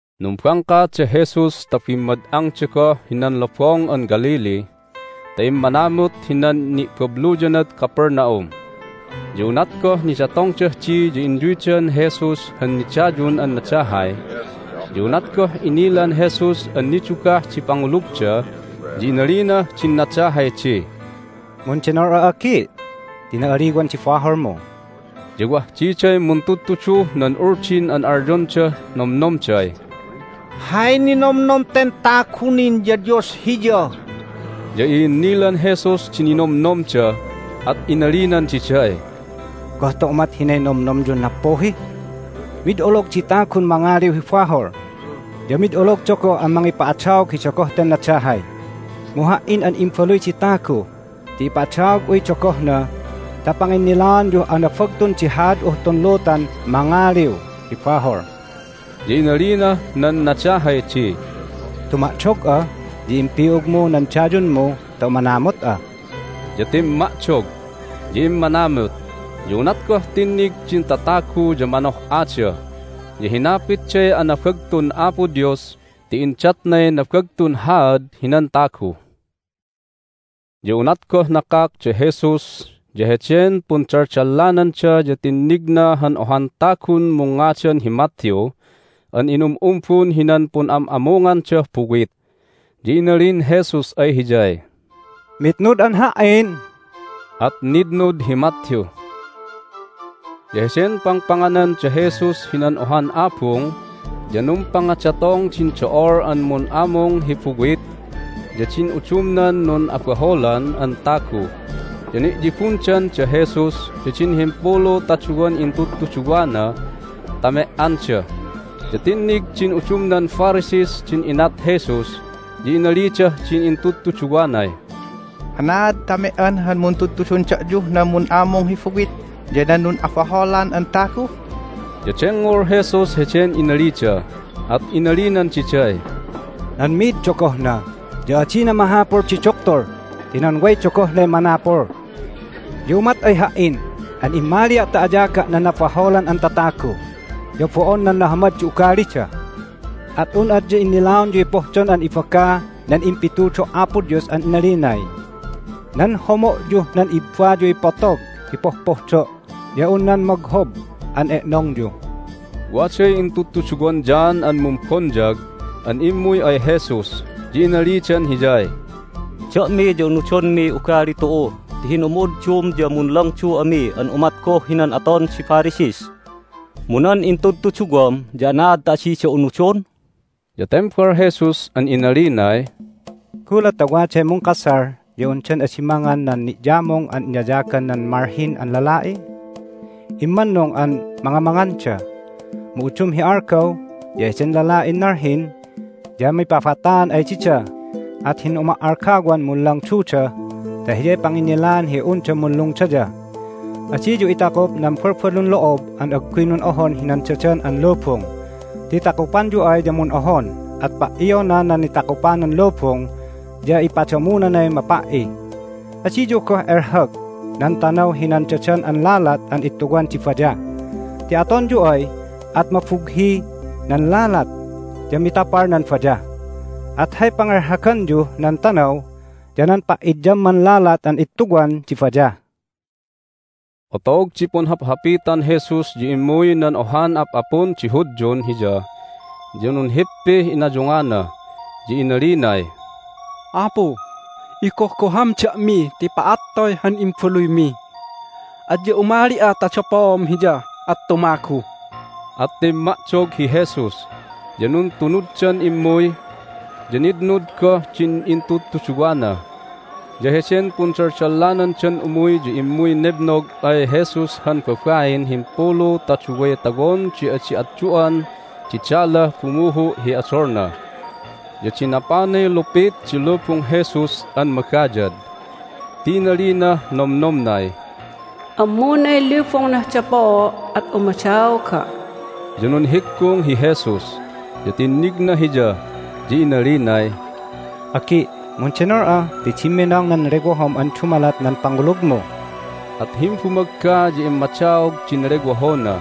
Numbangka da Jesus ta bimmad'angda goh hinan Lobong an Galilee ta immanamut hinan ni'babluyanad Capernaum. Ya unat goh nidatongdah di ya inyuydan Jesus han nidayun an nadahay. Ya unat goh inilan Jesus an nidugah di pangulugda ya inalinah din nadahay di, "Mundenol'a, agi', ti na'aliwan di baholmu!" Ya wah diday muntudtuduh nan Uldin an alyondah nomnomday, "Hay ninomnom ten tagu nin ya Dios Hiya!" Ya i'innilan Jesus din ninomnomda, at inalinan diday, "Goh ta umat hinay nomnomyun nappuhi? Mid olog di tagun mangaliw hi bahol, ya mid ologda goh an mangipa'adaog hi dogoh ten nadahay. Mu Ha"in an Imbaluy di Tagu ya ipa'adaog'uy dogohna ta panginnilaanyuh anabagtun di haad'uh tun lutan mangaliw hi bahol." Ya inalinah nan nadahay di, "Tuma'dog'a, ya impi'ugmu nan dayunmu ta umanamut'a." Ya timma'dog, ya immanamut. Ya unat goh tinnig din tatagu ya manoh'ada, ya hinapitday anabagtun Apo Dios ti indatnay nabagtun haad hinan tagu. Ya unat goh nakak da Jesus ya heden pundaldallananda ya tinnigna han ohan tagun mungngadan hi Matthew an inum'umbun hinan pun'am'amungandah buwit. Ya inalin Jesus ay hiyay, "Mitnud'an Ha"in." At nitnud hi Matthew. Ya heden pangpanganan da Jesus hinan ohan abung ya numpangadatong din do'ol an mun'amung hi buwit ya din udumnan nun'abaholan an tagu, ya ni'yibundan da Jesus ya din himpulu ta duwan intudtuduwana ta me"anda. Ya tinnig din udumnan Pharisees din inat Jesus, ya inalidah din intudtuduwanay, "Anaad ta me"an han muntudtudun da'yuh nan mun'amung hi buwit ya nan nun'abaholan an tagu?" Ya dengngol Jesus heden inalida, at inalinan diday, "Nan mi'id dogohna ya adina mahapul di duktul ti nan way dogohnay manapul. Ya umat ay Ha"in an immalia' ta ayaga' nan nabaholan an tatagu, ya bo'on nan nahamad di ugalida. At un adya innilaonyuy pohdon an ibaga nan impitudo' Apo Dios an inalinay, Nan homo'yuh nan ibbayuy potog hi pohpohdo' ya un nan moghob an e'nongyu." Waday intudtuduwan John an Mumbonyag an immuy ay Jesus, ya inalidan Hiyay, "Da'mi ya unudonmiy ugali tu'u ti hin'umu'uddum ya munlangdu ami an umat goh hinan aton di Pharisees. Mu nan intudtuduwam ya anaad ta adida unudon?" Ya tembal Jesus an inalinay, "Gulat ta waday mungkasal ya undan adi mangan nan ni'yamung an inayagan nan malhin an lala'i? Immannung an mangamanganda. Mu udum hi algaw ya heden lala'in nalhin ya mipabataan ay dida, at hin'uma"algawan munlangduda ta hiyay panginnilaan hi unda munlungdaya. Adiyu itakup nan balbalun lo'ob an agguy nun'ohon hinan dadan an lubung, ti takupanyu ay ya mun'ohon, at pa"iona nan nitakupanan lubung, ya ipadamunanay mapa"i. Adiyu goh elhag nan tanaw hinan dadan an lalat an ittuwan di bayah, ti atonyu ay at mabughi nan lalat, ya mitapal nan bayah. At hay pangelhaganyuh nan tanaw ya nan pa'idyamman lalat an ittuwan di bayah." Otog di punhaphapitan Jesus ya immuy nan ohan ap'apun di Hudyun Hiya, ya nunhippih inayungana, ya inalinay, "Apu, igohgohan da'mi ti pa'attoy han imbaluymi! Adya umali'a ta dapoom hiya at tumagu." At timma'dog hi Jesus, ya nuntunuddan immuy, ya nitnud goh din intudtuduwana. Ya heden pundaldallandan umuy ya immuy nebnog ay Jesus han babain himpulu ta duway tawon di adi atdu'an di dalah bumuhu' hi odolna. Ya dinapanay lupit di lubung Jesus an magayad ti inalinah nomnomnay, "Ammunay lubungnah dapoo' at umadaoga'." Ya nunhiggung hi Jesus, ya tinnigna hiya, ya inalinay, "Agi', mundenol'a ti dimminong nan lewohom an dumalat nan pangulugmu!" At himbumagga ya immadaog din lewohona.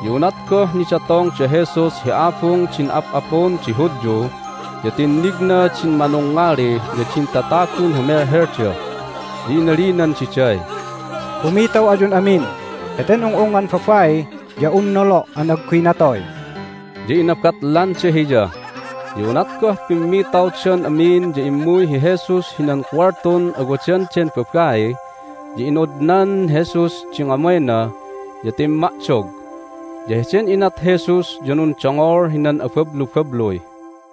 Ya unat goh nidatong da Jesus hi abung din ap'apun di Hudyu ya tinnigna din manungngali ya din tatagun humelhelda, ya inalinan diday, "Pumitaw ayun amin! Heten ung'ungngan babai ya un nolo' an agguy natoy." Ya inabatlanda Hiya. Ya unat goh pimmitawdan amin ya immuy hi Jesus hinan kuwaltun awadan den babai, ya inodnan Jesus di ngamayna, ya timma'dog. Ya heden inat Jesus ya nundongol hinan abablubabluy.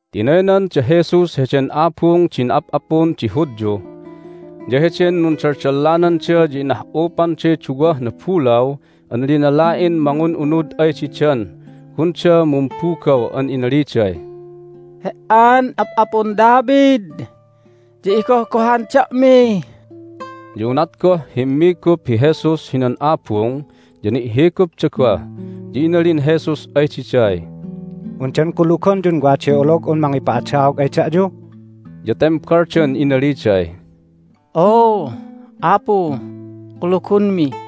Tinaynan da Jesus heden abung din ap'apun di Hudyu. Ya heden nundaldallananda ya inah'upanday duwah nabulaw an linala'in mangun'unud ay didan gunda mumbugaw an inaliday, "He"an Ap'apun David ya igohgohan da'mi!" Ya unat goh himmigup hi Jesus hinan abung ya ni'higupda goh, ya inalin Jesus ay diday, "Undan kulugonyun waday olog'un mangipa'adaog ay da'yu?" Ya tembaldan inaliday, "Oo, Apu, kulugonmi."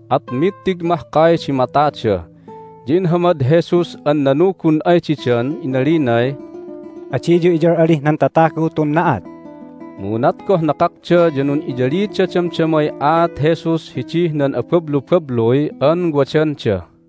At mittig mahkay di matada. Ya inhamad Jesus an nanugun ay didan inalinay, "Adiyu iyal'alih nan tatagu tun na'at!" Mu unat goh nakakda ya nun'iyalida damdamay aat Jesus hidih nan abablubabluy an wadanda.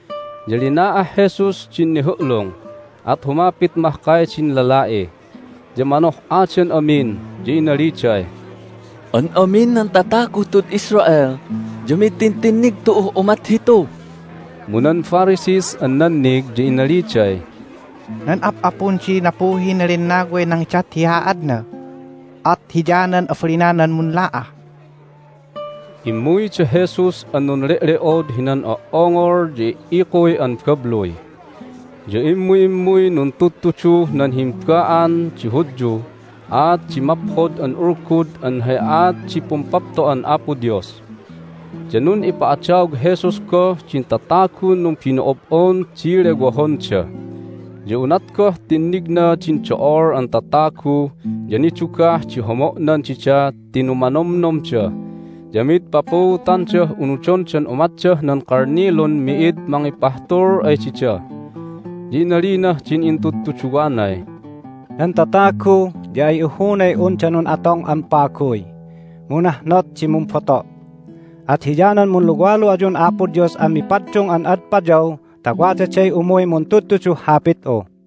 Ya lina'ah Jesus din nihu'lung, at humapit mahkay din lala'i. Ya manoh'adan amin, ya inaliday, "An amin nan tataguh tud Israel ya mid tintinnig tu'uh umat hitu!" Mu nan Pharisees an nannig ya inaliday, "Nan ap'apun di nappuhin lennaway nangidat hi haadna, at hiyanan abalinanan munla'ah." Immuy da Jesus an nunle'le'od hinan o"ongol ya i"ikuy an babluy. Ya immu'immuy nuntudtuduh nan himba'an di Hudyuh aat di Maphod an Ulgud an hay aat di Pumpapto'an Apo Dios. Ya nun'ipa'adaog Jesus goh din tatagun numbino'ob'on di lewohonda. Ya unat goh tinnigna din do'ol an tatagu ya nidugah di homo'nan dida ti numanomnomda, ya mid papuutandah unudondan umatdah nan kalnilun mi'id mangipahtul ay dida. Ya inalinah din intudtuduwanay, "Nan tatagu ya ay ihunay unda nun'atong an paguy, mu nahnot di mumboto'. At hiyanan munluwalu ayun Apo Dios an mipaddung an ad payaw ta wadaday umuy muntudtuduh Hapit'u."